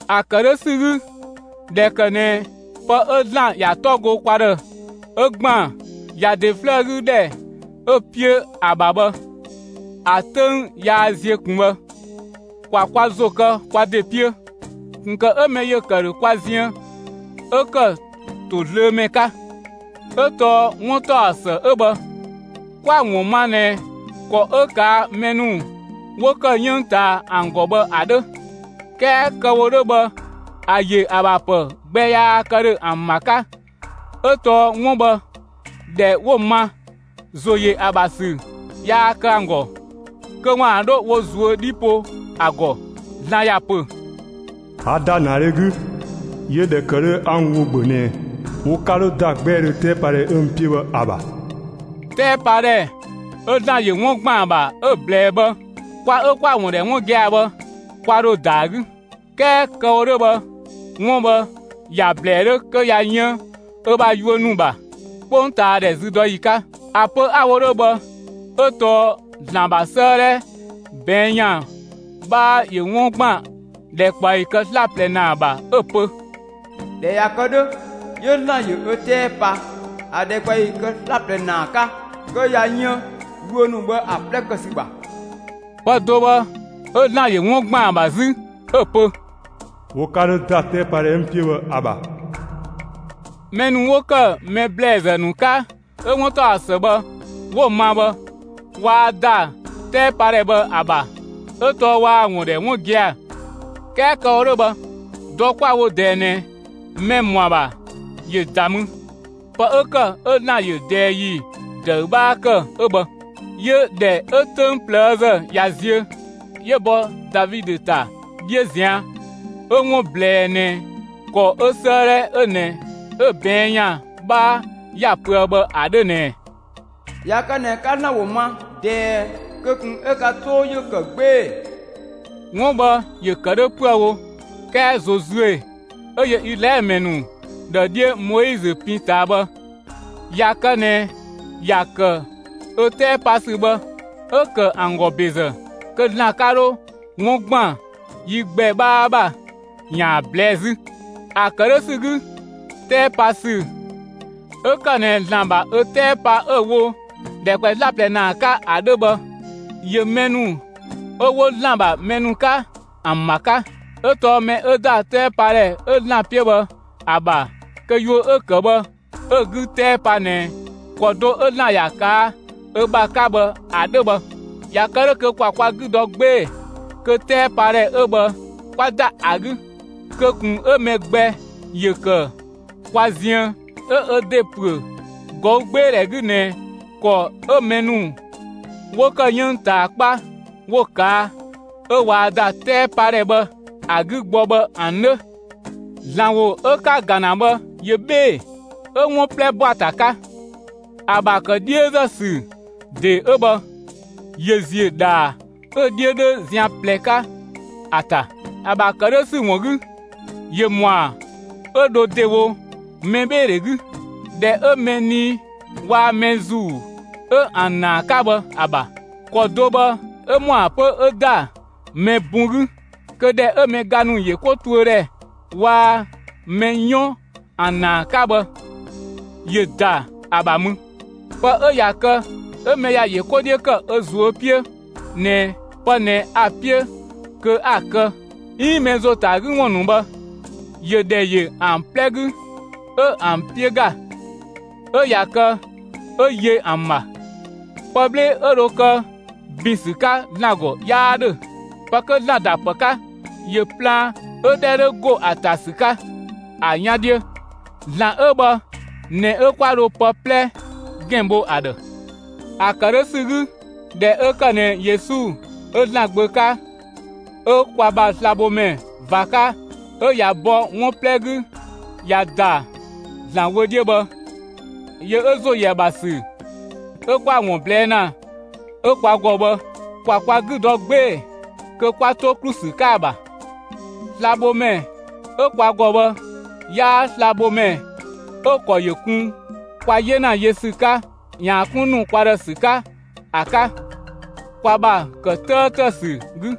‑A ‑kë 'dhö ‑sü 'gü, ꞊dhɛ ‑kë ꞊nɛ pë 'ö ‑Zlan ‑ya 'tɔ go kwa ‑dhë 'ö ‑gban ‑ya ‑de 'flëë 'gü ‑dhɛ 'ö‑ 'piö ‑a ‑bha bhë, ‑a 'töng yaa ziö ꞊kun bhë, ‑kwa kwa ‑zo kë kwa ‑de 'piö, ꞊kun ‑kë 'ö mɛ ‑yö ‑kë ‑dhö kwa ziën 'ö ‑kë ‑tozlöömɛ 'ka. 'Ö tɔɔ 'wuntaɔsë 'ö bhë, 'kwa‑ ‑wun ma ꞊nɛ ‑kɔ 'ö ꞊kaa' mɛ ‑nu 'wo ‑kë 'yënng ꞊taa ‑an ‑gɔ bhë ‑a 'dhö; 'kɛɛ kë‑ wo 'dhö bhë ‑a ‑yö ‑a ‑bha ‑pë gbɛ yaa kë ‑dhö ‑an ‑bha 'ka, 'ö tɔɔ 'wun bhë ‑dhɛ 'wo‑ ma, ‑zo ‑yö ‑a ‑bha ‑sü yaa kë ‑an ‑gɔ kö ‑waan 'dho wo ꞊zuö' 'dhi po ‑a ‑gɔ. ‑Zlan ‑ya ‑pö: A ‑da ‑naadhe 'gü; 'yö ‑dhɛ ‑kë 'dhö 'a n ‑wo ‑bhö ꞊nɛ wo 'ka 'dho ‑da 'gbɛɛdhö 'tɛɛpadhɛ 'ö n 'piö bhë ‑a ‑bha. 'Tɛɛpadhɛ 'ö ‑Zlan ‑yö 'wun ‑gban ‑a ‑bha 'ö‑ ꞊blɛɛ bhë, kwa 'ö 'kwa‑ ‑wun ‑dhɛ 'wun gia‑ bhë, kwa ‑dho ‑da ‑a 'gü; 'kɛɛ kë‑ wo 'dhö bhë, 'wun bhë ‑ya ꞊blɛɛ 'dhö kö ꞊ya yën ö ‑bha yuö ‑nu ‑bha 'kpongtaadhɛ züdɔyi 'ka. ‑A pö 'a‑ wo 'dhö bhë 'ö tɔɔ ‑Zlan ‑bha 'sëëdhɛ ꞊bɛɛn' ‑yan 'bhaa ‑yö 'wun ‑gban ‑dhɛkpaɔyi kë 'slaplɛ ‑naa ‑bha, 'ö‑ pö: ꞊Dhɛ ꞊ya kë 'dhö, 'yö ‑Zlan ‑yö ö 'tɛɛ pa ‑a ‑dhɛkpaɔyi 'slaplɛ ‑naa 'ka, kö ꞊ya yën yuö ‑nu bhë ‑an 'plɛ kë ‑sü ‑bha. Pë do bhë 'ö ‑Zlan ‑yö 'wun ‑gban ‑a ‑bha 'zü 'ö‑ pö: Wo 'ka 'dhö ‑da 'tɛɛpadhɛ 'ö n 'piö bhë ‑a ‑bha. Mɛ ‑nu 'wo ‑kë mɛ ‑blɛɛzë ‑nu 'ka 'ö 'wuntaɔsë bhë 'wo‑ ma bhë, waa ‑da 'tɛɛpadhɛ bhë ‑a ‑bha 'ö tɔɔ waa‑ ‑wun ‑dhɛ 'wun gia‑; 'kɛɛ kë‑ wo 'dhö bhë, dɔ 'kwa‑ wo ꞊dɛɛ ꞊nɛ mɛ‑ ‑mɔ ‑a ‑bha ‑yö ‑da mü. Pë 'ö ‑kë 'ö ‑Zlan ‑yö ꞊dɛɛ ‑yi ‑dëü 'bhaa ‑kë 'ö bhë. 'Yö ‑dhɛ 'ö 'töng ꞊plëëzë ꞊ya ziö, 'yö ‑bɔ Davidö ‑ta 'dhiö ꞊zian', 'ö‑ 'wun ꞊blɛɛ ꞊nɛ ‑kɔ 'ö 'sëëdhɛ 'ö ꞊nɛ 'ö‑ ꞊bɛɛn' ‑yan 'bhaa ‑ya pöë bhë ‑a 'dhö ꞊nɛ: ꞊Ya kë ꞊nɛ 'ka ‑Zlan ‑wo ma ꞊dɛɛ, kö ꞊kun 'ö ka 'too ‑yö ‑kë 'gbee‑! 'Wun bhë ‑yö ‑kë 'dhö 'püë‑ wo 'kɛɛ Zozue ('ö yö Izlaɛlö ‑mɛ ‑nu ‑dhë 'dhiö Moizö pin ꞊taa bhë) ꞊ya kë ꞊nɛ ‑ya ‑kë 'ö 'tɛɛ pa ‑sü bhë 'ö ‑kë ‑an ‑gɔ ‑bezë, kö ‑Zlan 'ka 'dho 'wun ‑gban yi gbɛ 'bhaa ‑bha ‑yaan ꞊blɛɛ'‑ 'zü. ‑A ‑kë 'dhö ‑sü 'gü, 'tɛɛpasü 'ö ‑kë ꞊nɛ ‑Zlan ‑bha ö 'tɛɛ pa 'ö‑ wo ‑dhɛkpaɔyi 'slaplɛ ‑naa 'ka ‑a 'dhö bhë, ‑yö mɛ ‑nu 'ö 'wo ‑Zlan ‑bha mɛ ‑nu 'ka ‑an ‑bha 'ka. 'Ö tɔɔ mɛ 'ö ‑da 'tɛɛpadhɛ 'ö ‑Zlan 'piö bhë ‑a ‑bha kö yuö 'ö‑ ‑kë bhë 'ö‑ 'gü 'tɛɛ pa ꞊nɛ ‑kɔ do 'ö ‑Zlan ‑ya ꞊kaa' ö ‑bha 'ka bhë ‑a 'dhö bhë. ꞊Ya kë 'dhö, kö ‑kwa kwa 'gü dɔ 'gbee‑ kö 'tɛɛpadhɛ 'ö bhë 'kwa ‑da ‑a 'gü; kö ꞊kun 'ö mɛ gbɛ ‑yö ‑kë kwa ziën 'ö ö ‑de ‑püö ꞊gɔügbeedhɛ 'gü ꞊nɛ ‑kɔ 'ö mɛ ‑nu 'wo ‑kë 'yënng ꞊taa 'kpa 'wo‑ ꞊kaa' 'ö waa ‑da 'tɛɛpadhɛ bhë ‑a 'gü gbɔ bhë ‑an 'dhö. ‑Zlan ‑wo 'ö 'ka‑ ‑ga ‑na bhë ‑yö 'bhee‑, 'ö 'wun 'plɛ ‑bɔa ‑ta 'ka. ‑A ‑bha ‑kë 'dhiözë ‑sü ‑de 'ö bhë, ‑yö ‑ziö ‑dhaa 'ö‑ 'dhiö 'dhö zian ꞊plɛ 'ka ‑a ‑ta. ‑A ‑bha ‑kë 'dhö ‑sü ‑wun 'gü, ‑yö ‑mɔa 'ö dho ‑dewo mɛbheedhe 'gü, ‑dhɛ 'ö mɛ nii waa‑ mɛ ‑zuu 'ö ‑an ‑naa 'ka bhë ‑a ‑bha. ‑Kɔ do bhë 'ö ‑mɔa 'pö 'ö ‑da mɛ bun 'gü kö ‑dhɛ 'ö mɛ ga ‑nu ‑yö 'ko tuö ‑dhɛ waa‑ mɛ 'yɔn ‑an ‑naa 'ka bhë, ‑yö ‑da ‑a ‑bha mü. Pë 'ö ꞊ya kë 'ö mɛ ‑ya ‑yö 'ko 'dhiö ‑kë ö ꞊zuö' 'piö ꞊nɛ pë ꞊nɛ a‑ 'piö kö 'a‑ kë 'iin mɛ ‑zo ‑ta ‑a 'gü ‑wun ‑nu bhë, ‑yö ‑dhɛ ‑yö ‑an 'plɛ 'gü 'ö ‑an 'piö ‑ga; 'ö ꞊ya kë 'ö yö ‑an ‑bha. Pë 'bhle 'ö dho kë ‑bin ‑sü 'ka ‑Zlan ‑gɔ 'yaa 'dhö. Pë 'kö ‑Zlan ‑da ‑pë 'ka, ‑yö plaan 'ö 'dhɛ 'dhö ‑go ‑a ‑ta ‑sü 'ka, ‑a 'yan 'dhiö; ‑Zlan 'ö bhë ꞊nɛ 'ö 'kwa dho pë 'plɛ ‑gɛn bho ‑a ‑dhë. ‑A ‑kë 'dhö ‑sü 'gü, ꞊dhɛ 'ö ‑kë ꞊nɛ Yesu 'ö ‑Zlan Gbö 'ka, 'ö kwa ‑bha slabhomɛ ꞊va 'ka 'ö ꞊ya bɔ 'wun 'plɛ 'gü ꞊ya ‑da ‑Zlan wö 'dhiö bhë, yö 'ö ‑zo ‑yö ‑a ‑bha ‑sü 'ö 'kwa‑ ‑wun ꞊blɛɛ' ‑na 'ö kwa ‑gɔ bhë, ‑kwa kwa 'gü dɔ 'gbee‑ kö 'kwa 'to ‑klu ‑sü 'ka ‑a ‑bha. Slabhomɛ 'ö kwa ‑gɔ bhë 'yaa slabhomɛ 'ö‑ ‑kɔ ‑yö kun kwa 'yena yö ‑sü 'ka ‑yaan 'kun ‑nu kwa ‑dhë ‑sü 'ka ‑a 'ka kwa ‑bha ‑kë 'tëëtë ‑sü 'gü;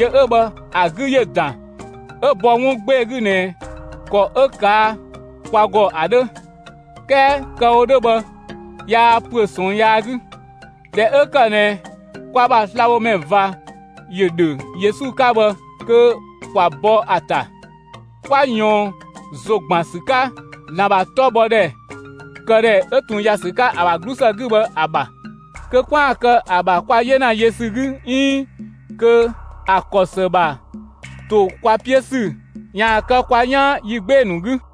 yö 'ö bhë, ‑a 'gü ‑yö ‑dan 'ö bɔ 'wun 'gbee‑ 'gü ꞊nɛ ‑kɔ 'ö ꞊kaa' kwa ‑gɔ ‑a 'dhö; 'kɛɛ kë‑ wo 'dhö bhë, yaa ‑püö ꞊sɔɔn yaa 'gü. ꞊Dhɛ 'ö ‑kë ꞊nɛ kwa ‑bha slabhomɛ ꞊va ‑yö ‑dhö Yesu 'ka bhë kö ‑kwa bɔ ‑a ‑ta, 'kwa ꞊yɔɔn ‑zo ‑gban ‑sü 'ka ‑Zlan ‑bha 'tɔbhɔdhɛ këdhɛ 'ö ꞊tun ꞊ya ‑sü 'ka ‑a ‑bha 'glusë 'gü bhë ‑a ‑bha, kö 'kwaan‑ kë ‑a ‑bha kwa 'yena yö ‑sü 'gü 'iin kö ‑a ‑kɔ ‑së ‑bha ‑to kwa 'piö ‑sü ‑yaan kë kwa 'yaan yi 'gbee‑ ‑nu 'gü.